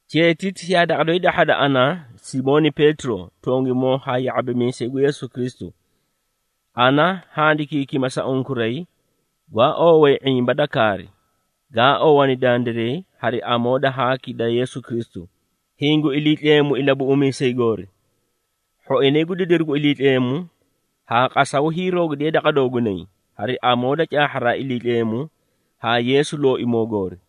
Cheetiti yaa daqa doyi dahhada ana, Simooni Peetiro, tongimoo haa ya⁄abimiisay gu Yeesu Kristu. Ana handikiikima sa unkuray, gwaa oowee ⁄imba da kaari, gaa oowani dandiray hari amoo da haaki da Yeesu Kristu, hiĩ gu Iliitleemu Ilabuꞌumiisay goori. Hhoinay gu didiru gu Iliitleemu, haa qasaw hiiroogidiye daqa doogunay, hari amoo da caahharaa Iliitleemu haa Yeesu Looimoo goori.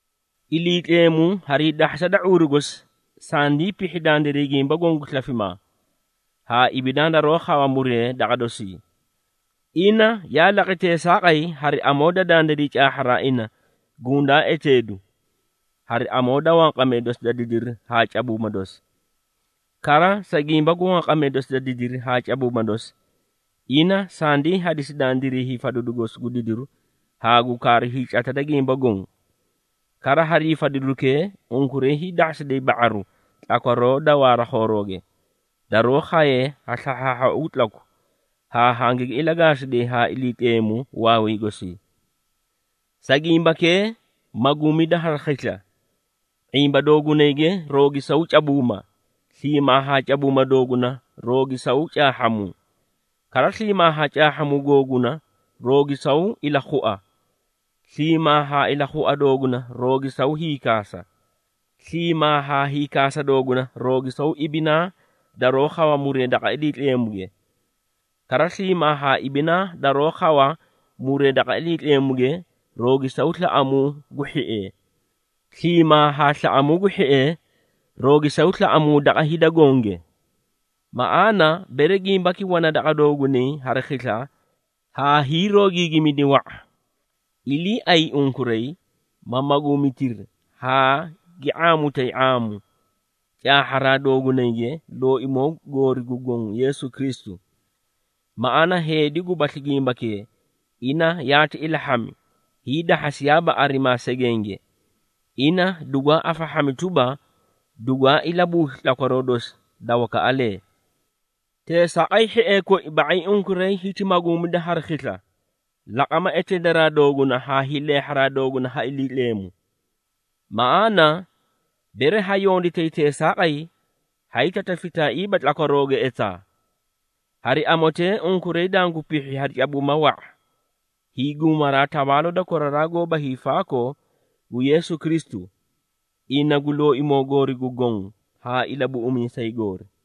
Iliitleemu harii dahhasa da ⁄uuru gosi, sindii pihhi dandiray gimba goõ gu slafimaa, haa ibinaa daroó khawa muree daqa dosii. Ina yaa laqi teesaaqay, hari amoo da dandiray caahharaa ina gundaa eteedu, hari amoo da wanqamee dosi da didiru haa cabuuma dosi. Kara sa gimba gu wanqamee dosi da didiri haa cabuuma dosi, ina sandii hadisi dandiray hiifadidu gosi gu didiru haa gu kaaru hiicata da gimba goõ. Kara, harii fadidukee, unkuray hiidahhasiday ba⁄aru tlakwaroo da waara khoorooge, daroó khaye ha slahhaahhaau gu tlaku, haa hangigi ilagaasiday haa Iliitleemu waaway gosii. Sa gimbakee, maguumida hari khisla, ⁄imba doogunayge roogisaw cabuuma, sliimaa haa cabuuma dooguna roogisaw caahhamuu. Kara, sliimaa haa caahhamuu googuna roogisaw ilakhua. Sliimaa haa ilakhua dooguna roogisaw hiikaasa. Sliimaa haa hiikaasa dooguna roogisaw ibinaa daroó khawa muree daqa Iliitleemuge. Kara, sliimaa haa ibinaa daroó khawa muree daqa Iliitleemuge, roogisaw slaꞌamuu gu hhiee. Sliimaa haa slaꞌamuu gu hhiee roogisaw slaꞌamuu daqa hida gonge. Maꞌaana, bere gimbaki wana daqa doogunay hari khisla, haa hiiroogiigimidi wa⁄a, iliiay unkuray, ma maguumitiri haa gi ⁄aamutay ⁄aamu, caahharaa doogunayge Looimoo goori gu Goõ Yeesu Kristu. Maꞌaana, heedi gubasli gimbakee, ina yaati ilahhami, hiidahhasiyaaba arimaa segenge. Ina dugwaa afahhami tuba, dugwaa ilabuusli tlakwaroo dosi da wakaꞌalee. Teesaaqay hhiee koi, ba⁄ay unkuray hiti maguumida hari khisla, laqama eteedaraa dooguna haa hiileehharaa dooguna ha Iliitleemu. Maꞌaana, bere ha yonditay teesaaqay, haay tatafitaaiiba tlakwarooge etaa. Hari amotee, unkuray dangu pihhi hari cabuuma wa⁄a, hiiguumaraa tawaaloo da koraraa goóba hiifaakoo gu Yeesu Kristu, ina gu Looimoo goori gu Goõ haa Ilabuꞌumiisay goori.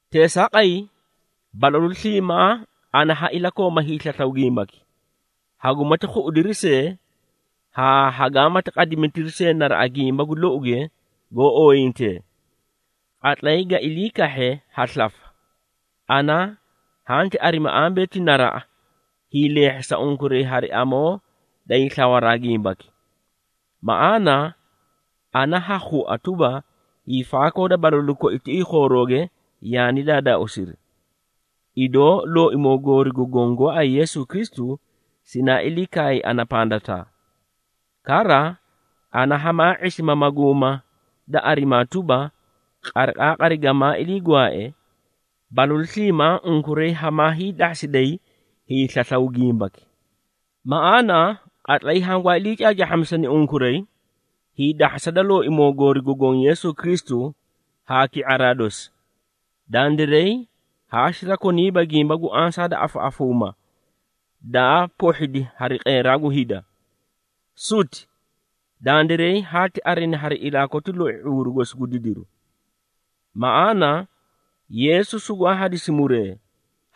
Teesaaqay, balalu sliimaa ana ha ilakooma hiislaslaw gimbaki, hagumati khuꞌudiri see, haa hagaamati qadimitiri see naraꞌa gimba gu louge goó oyintee. Qatlay ga ilii kahhe ha slafa, ana hanti arimi ambee ti naraꞌa, hiileehhisa unkuray hari amoo da hiislawaraa gimbaki. Maꞌaana, ana ha khua tuba, hiifaakoo da balalu koi tiꞌii khoorooge yaani daadaauusiri, idoo Looimoo goori gu Goõ gooay Yeesu Kristu, sinaa ilii kaay ana pandataa. Kara, ana hamaa ⁄isima maguuma da arimaa tuba, qariqaaqari gamaa ilii gwaae, balalu sliimaa unkuray hamaa hiidahhasiday hiislaslaw gimbaki. Maꞌaana, qatlay hangwaa iliicaacaahhamisani unkuray, hiidahhasa da Looimoo goori gu Goõ Yeesu Kristu haa ki⁄araa dosi, dandiray haa sirakoniiba gimba gu ansaa da afaꞌafuuma daa pohhidi hari qeeraa gu hida. Suti! Dandiray haati arini hari ilaa koti loi ⁄uuru gosi gu didiru. Maꞌaana, Yeesu sugwaa hadisi muree,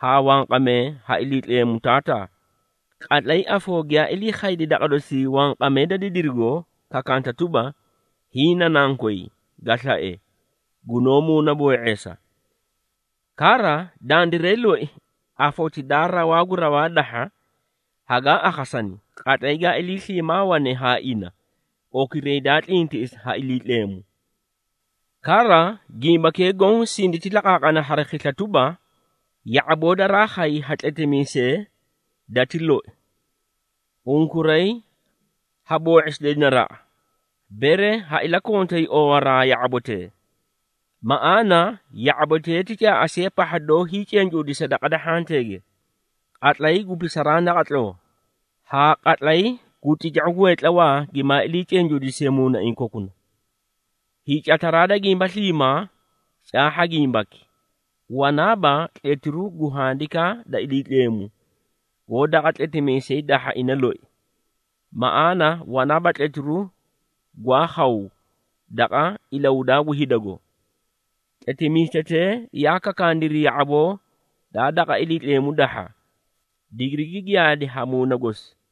haa wanqamee ha Iliitleemu Taataa, qatlay afoo giyaa ilii khaydi daqa dosii wanqamee da didirigo, kakaanta tuba, “Hiĩ na Nankoy, ga slae, gunoó muunaboo⁄eesa.” Kara, dandiray loi, afoti daa rawaa gu raw dahha, hagaa akhasani, qatlay gaa ilii sliimaa wane haa ina, okiray daa tlintiꞌisi ha Iliitleemu. Kara, gimbakee goõ sinditi laqaaqana hari khisla tuba, ya⁄aboo daraa khay ha tletimiisee dati loi. Unkuray ha boo⁄isiday naraꞌa, bere ha iliikontay oowaraa ya⁄abotee. Maꞌaana, ya⁄abotee ti caaꞌasiya pahha doó hiicencuudisa daqa da hhanteege, qatlay gu pisaraa naqatloo, haa qatlay tica⁄u gu hheetlawaa gimaa ilii cencuudisiye muunaiĩ kokunay. Hiicataraa da gimba sliimaa, caahha gimbaki. Wanaaba tletiru gu Handikaa da Iliitleemu, goó daqa tletimiisay dahha ina loi. Maꞌaana, wanaaba tletiru gwaa khaw, daqa ilahudaa gu hidago. Tletimiisetee yaa kakaaniri ya⁄aboo daa daqa Iliitleemu dahha, digirigi giyaadi ha Muuna gosi.